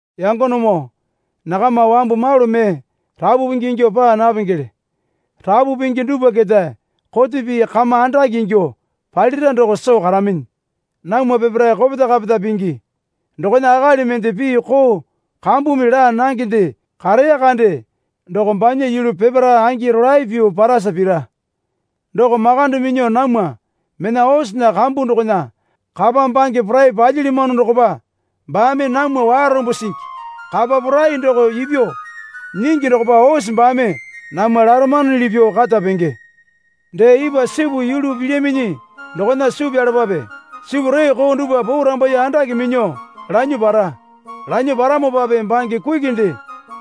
Yangonemoo nakama wambu malu mee rapu pingi ingyuo paa napengele. Rapu pingi dupwa keta kote pii kama andakele ingyuo palira doko soo karaminyi. Namwa peparae kopeta kapeta pingi. Dokona akali mende pii koo kambumi laa nangende kareya kande doko banya yulu peparae angi rolae pyuo parasa pira. Doko makande minyuo namwa mena osena kambu dokona kapa bange porai palyilyamano dokopa baame namwa warombo singi. Kapa porai doko ipyuo nyingi dokopa ose baame namwa laramanuli pyuo kata penge. Dee ipwa sipu yulu pilyaminyi dokona suu pyalapape. Sipu reeko dupwa porambaiye andake minyuo lanyuo para. Lanyuo paramopape bange kukinde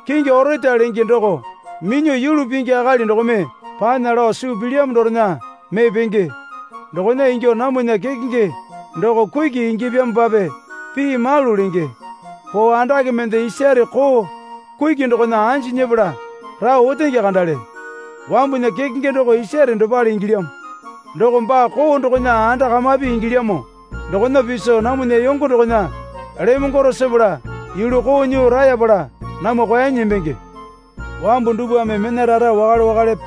kingi orata lenge doko minyuo yulu pingi akali dokome panya lao suu pilyamo dorena mee penge. Dokona ingyuo namwana kekenge doko kuki ingyapyamopape pii malu lenge. Poo andake mende isare koo kuki dokona anji nyepala rao otenge kandale. Wambunya kekenge doko isare dopale ingilyamo. Doko baa koo dokona anda kamape ingilyamo dokona piso namwana yongo dokona lemongwaro sepala yulu koo nyuo rayapala namwa kwuanyi nembenge. Wambu dupwame mena rara wakale wakalepe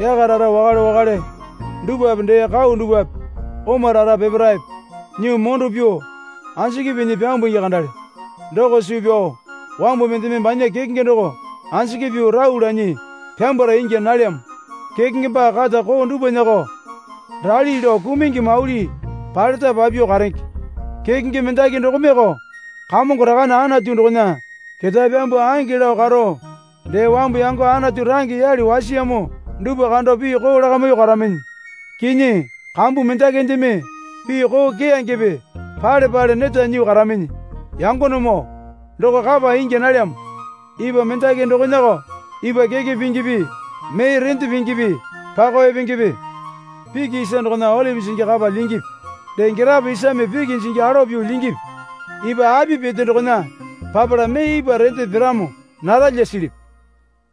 yaka rara wakale wakale dupwape dee kau dupwape oma rara peparaepe nyuo mondo pyuo anjiki pinyi pyambungi kandale. Doko suu pyao wambu mendeme banya kekenge doko anjiki pyuo rau lanyi pyambwara ingya nalyamo. Kekenge baa kata koo dupwanako rali lao kumungi mauli paleta papyuo karenge. Kekenge mendaki dokomeoko Kamongo Rakane Anatu dokona ketae pyambuo ange lao karo dee wambu yango Anatu range yale wasiyamo dupwa kando pii koo lakamyuo karaminyi. Kinyi kambu mendakindeme pii koo keyangepe pale pale neta nyuo karaminyi. Yangonemoo doko kapa ingya nalyamo. Ipwa mendaki dokonako ipwa keke pingipi mee rende pingipi pakao epengepe? Piki isa dokona olipi jingi kapa lyingipi? Dee girapo isame piki jingi alowa pyuo lyingipi? Ipwa api pete dokona papala mee ipwa rende piramo naralya silipi?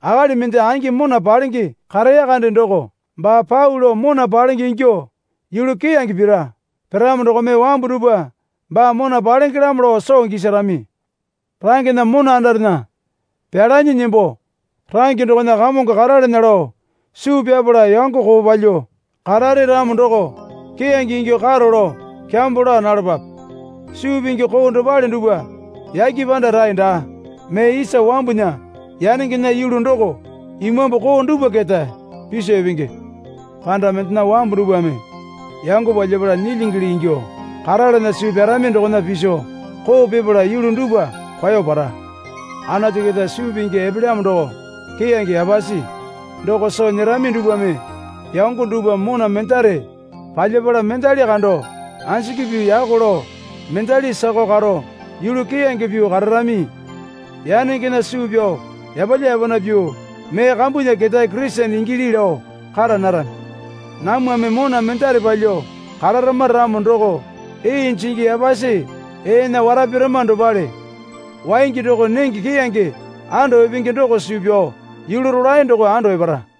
Akali mende angi mona palenge kareya kande doko baa pau lao mona palenge ingyuo yulu keyange pira. Piramo dokome wambu dupwa baa mona palengelamo lao soo gisarami. Rangena mona andarena pelanyi nembo range dokona kamongo karalana lao suu pyapala yango koo palyuo karare ramo doko keyange ingyuo karo lao kyambo laa nalapape. Suu pingi koo dopale dupwa yake panda rae daa. Mee isa wambunya yanengena yulu doko imambu koo dupwa keta piso epenge. Panda mendena wambu dupwame yango palyapala nyilyingili ingyuo karalana suu pyarami dokona piso koo pipala yulu dupwa kwao para. Anatu keta suu pingi epelyamo doko keyange yapasi. Doko soo nyerami dupwame yango dupwa mona mendare palyapala mendali kando anjiki pyuo yako lao mendali sakao karo yulu keyange pyuo kararami. Yanengena suu pyao yapalya yapana pyuo mee kambunya ketae Kurisene ingili lao kara narami. Namwame mona mendare palyuo kararama ramo doko ee jingi yapasi eena wara pirama dopale. Waingi doko nenge keyange ando epenge doko suu pyao yulu rolae doko ando epara.